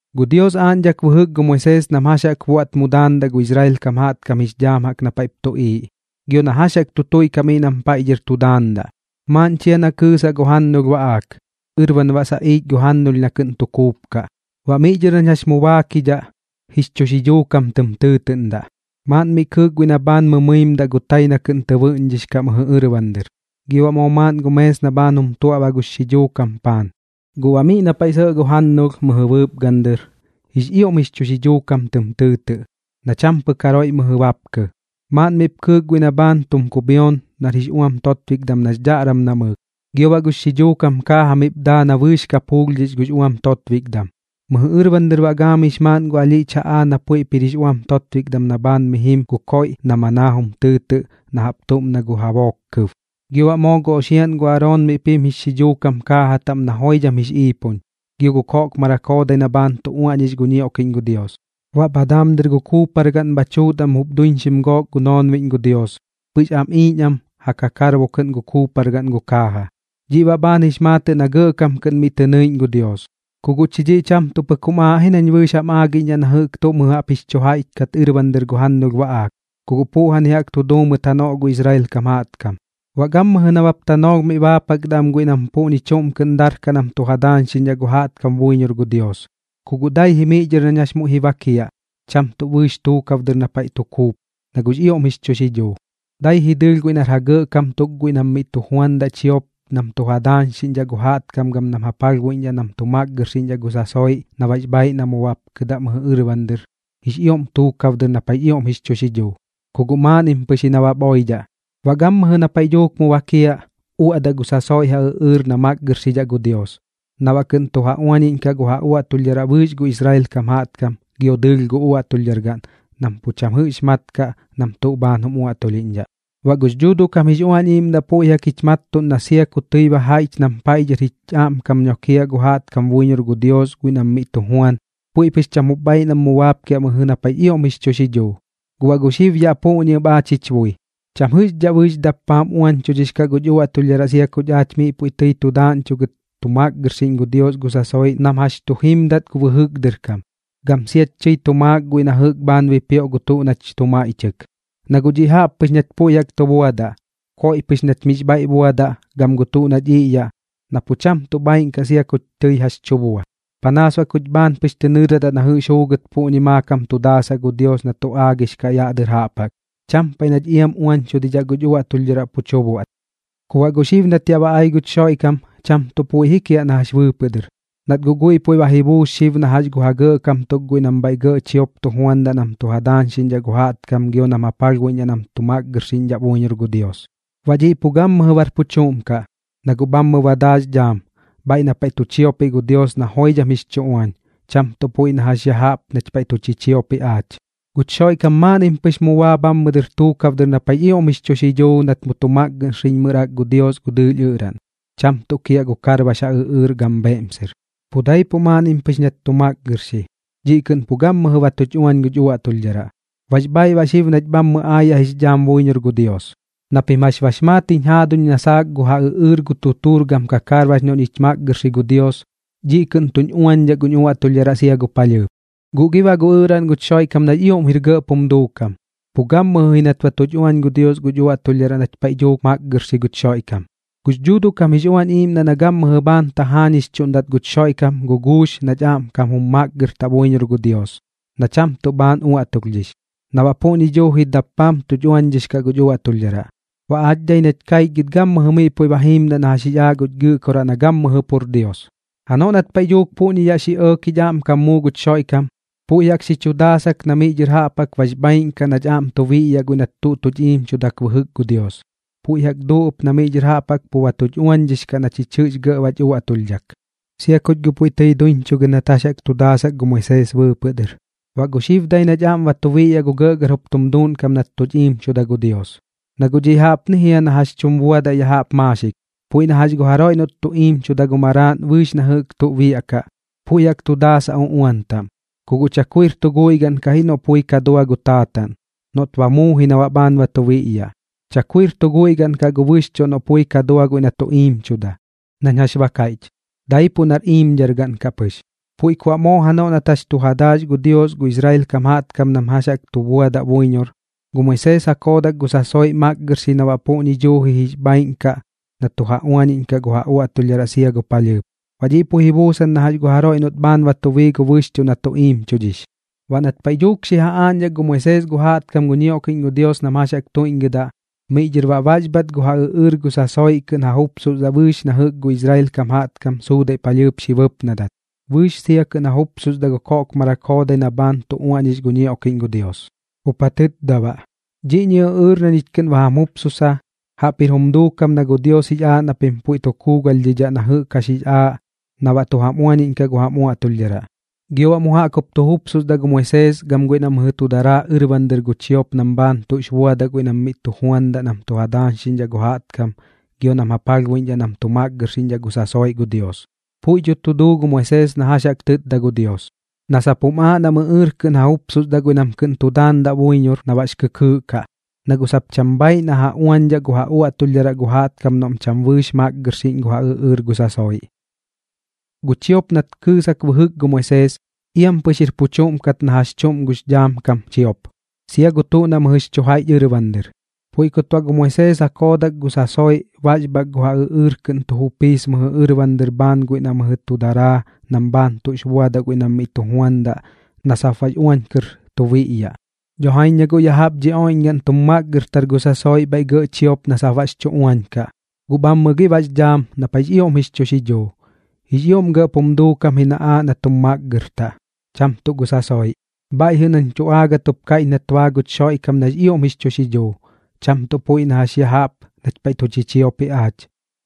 Gu Dios aaꞌñdhak bɨjɨk gu Moisees nam jax jaꞌk buaꞌt mu daandaꞌ gu Israel kam jaꞌtkam jix dhaam jaꞌk na paiꞌp tuꞌiiꞌ, gio na jax jaꞌk tu tuiꞌkaꞌ miꞌ nam paiꞌ dhɨr tu daandaꞌ. Maaꞌn chia na kɨɨsaꞌ gu jannulh baꞌaak, ɨrban baꞌ saꞌiich gu jannulh na kɨꞌn tu kuupkaꞌ. Baꞌ miꞌ dhɨr nañ jax mu baakidhaꞌ, jix chu xidhuu kam tɨm tɨɨtɨꞌndaꞌ. Maaꞌn mi kɨɨk guiꞌ na bhaan mɨmɨimdaꞌ gu tai na kɨꞌn tɨ bɨꞌñdhix kaꞌ mɨjɨ ɨrban dɨr, gio baꞌ moo maaꞌn gu mees na bhaan jum tuaꞌba gux xidhuu kam paan. Guꞌ baꞌ miꞌ na paiꞌ sɇꞌ gu jannulh mɨjɨ bɨɨpgan dɨr, jix ioꞌm jix chu xidhuu kam tɨm tɨɨtɨꞌ, na cham pɨk jaroiꞌ mɨjɨ bapkɨ. Maaꞌn miꞌp kɨɨk guiꞌ na bhaan tum kubhion nar jix uam totbikdam nax dhaꞌram namɨɨk, gio baꞌ gux xidhuu kam kaaja miꞌp daa na bɨɨx kap juulhdhix gux uam totbikdam. Mɨjɨ ɨrban dɨr baꞌ gaamix maaꞌn gu alhiꞌch jaꞌaa na puiꞌp jir jix uam totbikdam na bhaan mi jim gu koiꞌ na manaa jum tɨɨtɨꞌ na jaꞌp tuꞌm na gu jabook kɨb. Gio baꞌ moo gu oxiaꞌn gu Aroon miꞌp jim jix xidhuu kam kaaja taꞌm na joidham jix iipun, gio gu koꞌkmarak joodai na bhaan tu uaꞌñix gu ñioꞌkiꞌñ gu Dios. Baꞌ bha daam dɨr gu kuupargaꞌn bha tuut am jup duiñxim gook gu noonbiꞌñ gu Dios, pɨx am iiñ am ja kakarbo kɨꞌn gu kuupargaꞌn gu kaaja. Dhiꞌ baꞌ bhaan jix maatɨꞌ na gɇꞌkam kɨꞌn miꞌ tɨ nɨiꞌñ gu Dios. Ku guꞌ chi dhiꞌ cham pɨk jum aaꞌ ji nañ bɨɨx jam aagiꞌñdhaꞌ na jɨꞌk tuꞌ mɨjɨ jaꞌp jix chu jaiꞌch kat ɨrban dɨr gu jannulh baꞌaak, ku guꞌ puꞌjani jaꞌk tu duu mɨt janoꞌ gu Israel kam jaꞌtkam. Baꞌ gammɨjɨ nabap tanoolh mi baapakdaꞌ am guiꞌ nam puꞌñi chuꞌm kɨꞌn darkaꞌ nam tu ja daañxiꞌñdhaꞌ gu jaꞌtkam buiñor gu Dios, ku guꞌ dai ji miꞌ dhɨr nañ jax muiꞌ ji bakiaꞌ, cham tuꞌ bɨɨx tuukab dɨr na paiꞌ tu kuup, na guꞌx ioꞌm jix chu xidhuu. Dai ji dɨɨlh guiꞌ nar ja gɇꞌkam tuk guiꞌ nam miꞌ tu juandaꞌ chiop nam tu ja daañxiꞌñdhaꞌ gu jaꞌtkam gam nam ja palhbuiꞌñdhaꞌ nam tu makgɨrxiꞌñdhaꞌ gu sasoiꞌ, na baꞌx bhaaiꞌ na mu bapkɨdaꞌ bhɨjɨmmɨ dɨr jix ioꞌm tuukab dɨr na paiꞌx ioꞌm jix chu xidhuu, ku guꞌ maaꞌnnim pɨx ji nabap oidhaꞌ. Baꞌ gammɨjɨ na paiꞌ dhuuk mu bakiaꞌ, uaꞌdaꞌ gu sasoiꞌ ja ɨꞌɨɨr na makgɨrxidhaꞌ gu Dios, na baꞌ kɨꞌn tu ja uañiꞌñkaꞌ gu ja uaꞌtulhdharaꞌ bɨɨx gu Israel kam jaꞌtkam gio dɨɨlh gu uaꞌtulhdhargaꞌn, nam pu cham jɨꞌx mat kaꞌ nam tuꞌ bhaan jum uaꞌtulhiꞌñdhaꞌ. Baꞌ gux Dhuuduꞌ kam jix Uañ Iiꞌmdaꞌ puiꞌ jaꞌk jich mattuꞌn na sia ku tɨi ba jaiꞌch nam paiꞌ dhɨr ja aꞌmkam nokiaꞌ gu jaꞌtkam buiñor gu Dios guiꞌ nam miꞌ tu juan, puiꞌ pɨx cham jup bhaaiꞌ nam mu baapkiaꞌ mɨjɨ dɨr na paiꞌx ioꞌm jix chu xidhuu. Guꞌ baꞌ gu xib yaꞌ puꞌñi ɨp aach jich bui, cham jɨꞌxdhaꞌ bɨɨx dappaam uañchudhix kaꞌ guch uaꞌtulhdharaꞌ sia kuch aach miꞌ puiꞌ tɨi tu daaꞌñchugɨt tu makgɨrxiꞌñdhaꞌ gu Dios gu sasoiꞌ nam jax tu jimdat gu bɨjɨk dɨr kam, gam siach tɨi tu maak guiꞌ na jɨꞌk bhaan bipioꞌ gu tuꞌ nach tu maiꞌchɨk. Na guꞌ dhiꞌ jaꞌp pɨx nach puiꞌ jaꞌk tu buadaꞌ, koiꞌ pɨx nach miꞌx bhaiꞌ buadaꞌ gam gu tuꞌ nach iꞌyaꞌ na pu cham tuꞌ bhaaiꞌn kaꞌ sia kuch tɨi jax chu bua, panaas baꞌ kuch bhaan pɨx tɨ nɨɨradaꞌ na jɨꞌx juugɨt puꞌñi maakam tu daasaꞌ gu Dios na tu aagix kaꞌ yaꞌ dɨr jaꞌp jaꞌk, cham paiꞌ nach iam uañchudidhaꞌ guch uaꞌtulhdharaꞌ pu chu buaꞌt. Ku baꞌ guꞌ xib nat yaꞌ ba ai guch Xoiꞌkam, cham tuꞌ puiꞌ ji kiaꞌ na jax bɨɨpɨꞌ dɨr, nat guꞌ guiꞌ jaꞌp ba ji buus xib na jax gu ja gɇꞌkam tuk guiꞌ nam bhaiꞌ gɇꞌ chiop tu juandaꞌ nam tu ja daañxiꞌñdhaꞌ gu jaꞌtkam gio nam ja palhbuiꞌñdhaꞌ nam tu makgɨrxiꞌñdhaꞌ buiñor gu Dios. Baꞌ dhiꞌ pu gammɨjɨ bar pu chuꞌm kaꞌ, na guꞌ bhammɨ ba daa jix dhaam, bhaiꞌ na paiꞌ tu chiopiꞌ gu Dios na joidham jix chu uañ, cham tuꞌ puiꞌ na jax ya jaꞌp nach paiꞌ tu chichiopiꞌ aach. Guch Xoiꞌkam maaꞌnnim pɨx mu baa bhammɨ dɨr tuukab dɨr na paiꞌx ioꞌm jix chu xidhuu nat mu tu makgɨrxiꞌñmɨrak gu Dios gu dɨɨlh ɨꞌraꞌn, cham tuꞌ kiaꞌ gu kakarbax ja ɨꞌɨɨr gam bheꞌmser. Pu daipuꞌ maaꞌnnim pɨx nat tu makgɨrxi, dhiꞌ kɨꞌn pu gammɨjɨ ba tuch uañdhix guch uaꞌtulhdharaꞌ, bax bhaaiꞌ baꞌ xib nach bhammɨ aayaꞌ jix dhaam buiñor gu Dios. Na pim jax bax maat jiñ jaaduñ na saak gu ja ɨꞌɨɨr gu tutuur gam karbax noꞌ ñich makgɨrxi gu Dios, dhiꞌ kɨꞌn tuñ uañdhaꞌ guñ uaꞌtulhdharaꞌ sia gu palhɨɨp. Guꞌ gi baꞌ gu ɨꞌraꞌn guch Xoiꞌkam nax ioꞌm jir gɇꞌp jum duukam, pu gammɨjɨ ji nat ba tuch uañ gu Dios guch uaꞌtulhdharaꞌ nat paiꞌ dhuuk makgɨrxi guch Xoiꞌkam. Gux Dhuuduꞌ kam jix Uañ Iiꞌmdaꞌ na gammɨjɨ bhaan tajaañixchuꞌndat guch Xoiꞌkam guguux nach aꞌmkam jum makgɨrtaꞌ buiñor gu Dios, na cham tuꞌ bhaan uaꞌtulhdhix, na baꞌ puꞌñi duuji dappaam tuch uañdhix kaꞌ guch uaꞌtulhdharaꞌ. Baꞌ aach dai nach kaichgɨt gammɨjɨ miꞌ puiꞌ ba jiimdaꞌ na jax jix aaꞌ guch Gɨꞌkoraꞌ na gammɨjɨ pur Dios. Janoꞌ nat paiꞌ dhuuk puꞌñi yaꞌ xi ɇɇk jich aꞌmkam muu guch Xoiꞌkam, puiꞌ jaꞌk xi chu daasak na miꞌ dhɨr jaꞌp jaꞌk bax bhaaiꞌn kaꞌ nach aꞌm tu biꞌyaꞌ guiꞌ nat tuꞌ tuch iimchudak bɨjɨk gu Dios. Puiꞌ jaꞌk duu ɨp na miꞌ dhɨr jaꞌp jaꞌk pu ba tuch uañdhix kaꞌ na chich jɨꞌx gɇꞌ bach uaꞌtulhdhak, sia kuch guꞌ puiꞌ tɨi duiñchugɨt nat jax jaꞌk tu daasak gu Moisees bɨɨpɨꞌ dɨr. Baꞌ gu xib dai nach aꞌm ba tu biꞌyaꞌ gu gɇꞌgɇr jup tum duuꞌnkam nat tuch iimchuda gu Dios. Na guꞌ dhiꞌ jaꞌpni jia na jax tum buadaꞌ ya jaꞌp maaxik, puiꞌ na jax gu jaroiꞌ noꞌt tu iimchuda gu maraaꞌn bɨɨx na jɨꞌk tuꞌ biaꞌkaꞌ, puiꞌ jaꞌk tu daasaꞌ uꞌuan taꞌm. Ku guꞌ chakuir tu guiꞌ gaꞌn kaꞌ ji noꞌ puiꞌ ka dua gu taataꞌn, noꞌt ba muu ji na baꞌ bhaan ba tu biꞌyaꞌ. Chakuir tu guiꞌ gaꞌn kaꞌ gu bɨxchuꞌ noꞌ guꞌ pui ka dua guiꞌ nat tu iimchuda, nañ jax ba kaiꞌch, daipuꞌ nar iimdhargaꞌn kaꞌ pɨx. Puiꞌ ku baꞌ moo janoꞌ nat jax tu ja daax gu Dios gu Israel kam jaꞌtkam nam jax jaꞌk tu buadaꞌ buiñor, gu Moisees ja koodak gu sasoiꞌ makgɨrxi na baꞌ puꞌñi duuji jix bhaaiꞌn kaꞌ na tu ja uañiꞌñkaꞌ gu ja uaꞌtulhdharaꞌ sia gu palhɨɨp. Baꞌ dhiꞌ puiꞌ ji buusan na jax gu jaroiꞌ noꞌt bhaan ba tu bii gu bɨxchuꞌ na tu iimchudhix. Baꞌ nat paiꞌ dhuuk xi ja aaꞌñdhak gu Moisees gu jaꞌtkam gu ñioꞌkiꞌñ gu Dios nam jax jaꞌk tuiꞌñgɨdaꞌ, miꞌ dhɨr baꞌ baxbhat gu ja ɨꞌɨɨr gu sasoiꞌ kɨꞌn ja jupsusdaꞌ bɨɨx na jɨꞌk gu Israel kam jaꞌtkam suudaiꞌ palhɨɨp xi bɨpnadat, bɨɨx sia kɨꞌn jupsusdaꞌ gu koꞌkmarak joodai na bhaan tu uaꞌñix gu ñioꞌkiꞌñ gu Dios. Jup ja tɨtda baꞌ: “Dhi ɨꞌɨɨr na ñich kɨꞌn ba jam jupsussa, jaꞌp jir jum duukam na gu Dios jix aaꞌ na pim puiꞌ jaꞌk tu kuugalhdhidhaꞌ na jɨꞌk jax jix aaꞌ na baꞌ tu jam uañiꞌñkaꞌ gu jam uaꞌtulhdharaꞌ.” Gio baꞌ mu jaꞌk jup tu jupsusdaꞌ gu Moisees gam guiꞌ na mɨjɨ tu daraa ɨrban dɨr gu chiop nam bhaan tuꞌx buadaꞌ guiꞌ nam miꞌ tu juandaꞌ nam tu ja daañxiꞌñdhaꞌ gu jaꞌtkam gio nam ja palhbuiꞌñdhaꞌ nam tu makgɨrxiꞌñdhaꞌ gu sasoiꞌ gu Dios. Puiꞌ dho tu duu gu Moisees na jax jaꞌk tɨtda gu Dios, na sap jum aaꞌ nam ɨꞌɨɨr kɨꞌn ja jupsusdaꞌ guiꞌ nam kɨꞌn tu daandaꞌ buiñor na baꞌx kɨkɨɨꞌ kaꞌ, na guꞌ sap cham bhaaiꞌ na ja uañdhaꞌ gu ja uaꞌtulhdharaꞌ gu jaꞌtkam noꞌm cham bɨɨx makgɨrxiꞌñ gu ja ɨꞌɨɨr gu sasoiꞌ. Gu chiop nat kɨɨsak bɨjɨk gu Moisees, iam pɨx jir pu chuꞌm kat na jax chuꞌm gux dhaam kam chiop, sia gu tuꞌ na mɨjɨx chu jaiꞌch ɨrban dɨr. Puiꞌ kut baꞌ gu Moisees ja koodak gu sasoiꞌ baxbhak gu ja ɨꞌɨɨr kɨꞌn tu jupiis mɨjɨ ɨrban dɨr bhaan guiꞌ na mɨjɨ tu daraa nam bhaan tuꞌx buadaꞌ guiꞌ nam miꞌ tu juandaꞌ na sap baꞌx uañ kɨr tu biꞌyaꞌ. Dho jaiñ na guꞌ ya jaꞌp dhi oiꞌñgaꞌn tum makgɨrtar gu sasoiꞌ bhaiꞌ gɇꞌ chiop na sap baꞌx chu uañ kaꞌ, guꞌ bhammɨ gi baꞌx dhaam na paiꞌx ioꞌm jix chu xidhuu, jix ioꞌm gɇꞌp jum duukam ji na aaꞌ na tum makgɨrtaꞌ, cham tuꞌ gu sasoiꞌ. Bhaiꞌ jɨꞌ nañ tu aagɨt jup kaiꞌch nat baa guch Xoiꞌkam nax ioꞌm jix chu xidhuu, cham tuꞌ puiꞌ na jax ya jaꞌp nach paiꞌ tu chichiopiꞌ aach,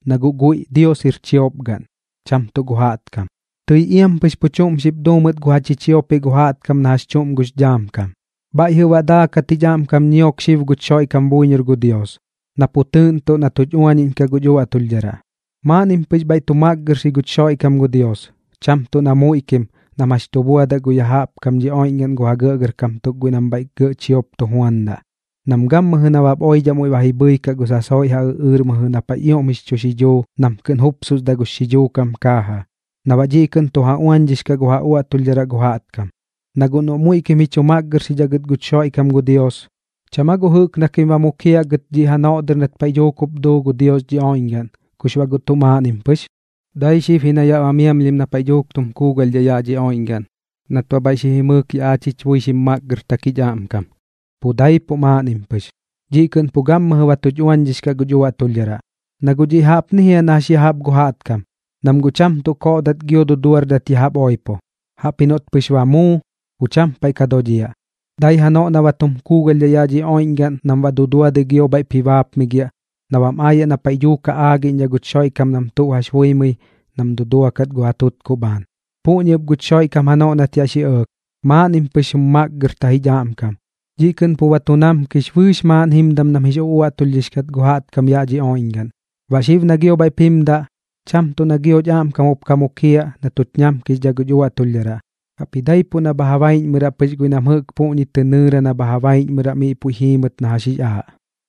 na guꞌ guiꞌ Dios jir chiopgaꞌn, cham tuꞌ gu jaꞌtkam. Tɨi iam pɨx pu chuꞌm xip duu mɨt gu ja chichiopiꞌ gu jaꞌtkam na jax chuꞌm gux dhaam kam. Bhaiꞌ jɨꞌ baꞌ daakat jich aꞌmkam ñiok xib guch Xoiꞌkam buiñor gu Dios, na pu tɨɨꞌntuꞌn na tuch uaniꞌñkaꞌ guch uaꞌtulhdharaꞌ. Maaꞌnnim pɨx bhaiꞌ tu makgɨrxi guch Xoiꞌkam gu Dios, cham tuꞌ na muiꞌkim nam jax chu buadaꞌ ya jaꞌp dhi oiꞌñgaꞌn gu ja gɇꞌgɇrkam tuk guiꞌ nam bhaiꞌ gɇꞌ chiop tu juandaꞌ, nam gammɨjɨ nabap oidhaꞌ muiꞌ ba ji bhɨikaꞌ gu sasoiꞌ ja ɨꞌɨɨr mɨjɨ na paiꞌx ioꞌm jix chu xidhuu nam kɨꞌn jupsusdaꞌ gux xidhuu kam kaaja, na baꞌ dhiꞌ kɨꞌn tu ja uañdhix kaꞌ gu ja uaꞌtulhdharaꞌ gu jaꞌtkam. Na guꞌ noꞌ muiꞌkim ji chu makgɨrxidhaꞌ gɨt guch Xoiꞌkam gu Dios, ¿cham aa guꞌ jɨꞌk na kim ba mukiaꞌ gɨt dhiꞌ janoꞌ dɨr nat paiꞌ dhuuk jup duu gu Dios dhi oiꞌñgaꞌn, kux baꞌ guꞌ tuꞌ maaꞌnnim pɨx? Dai xib na yaꞌ ba miamlhim na paiꞌ dhuuk tum kuugalhdhaꞌ yaꞌ dhi oiꞌñgaꞌn nat baꞌ bhaiꞌ xi jimɨɨk yaꞌ aach jich bui xim makgɨrtak jich aꞌmkam, pu daipuꞌ maaꞌnnim pɨx. Dhiꞌ kɨꞌn pu gammɨjɨ ba tu uañdhix kaꞌ guch uaꞌtulhdharaꞌ. Na guꞌ dhiꞌ jaꞌpni jia na jax ya jaꞌp gu jaꞌtkam, nam guꞌ cham tuꞌ koꞌdat gio duduardat ya jaꞌp oipo, jaꞌpji noꞌt pɨx ba muu, pu cham paiꞌ ka dodhiaꞌ, dai janoꞌ na ba tum kuugalhdhaꞌ yaꞌ dhi oiꞌñgaꞌn nam baꞌ duduadɨi giop bhaiꞌp ji baapmigiaꞌ na bam aayaꞌ na paiꞌ dhuuk ja aagiꞌñdhaꞌ guch Xoiꞌkam nam tuꞌ jax buimɨi nam duduakat gu ja tutkuꞌ bhaan. Puꞌñi ɨp guch Xoiꞌkam janoꞌ nat yaꞌ xi ɇɇk, maaꞌnnim pɨx jum makgɨrta jich aꞌmkam, dhiꞌ kɨꞌn pu ba tu namkix bɨɨx maaꞌn jimdam nam jix uꞌuaꞌtulhdhix gu jaꞌtkam yaꞌ dhi oiꞌñgaꞌn. Baꞌ xib na gio bhaiꞌp jimdaꞌ, cham tuꞌ na gioch aꞌmkam jup ka mukiaꞌ na tuch ñamkixdhaꞌ guch uaꞌtulhdharaꞌ, jaꞌpji daipuꞌ na bha ja baiꞌñmɨraꞌ pɨx guiꞌ nam jɨꞌk puꞌñi tɨ nɨɨra na bha ja baiꞌñmɨraꞌ miꞌ puiꞌ ji jiimɨt na jax jix aaꞌ.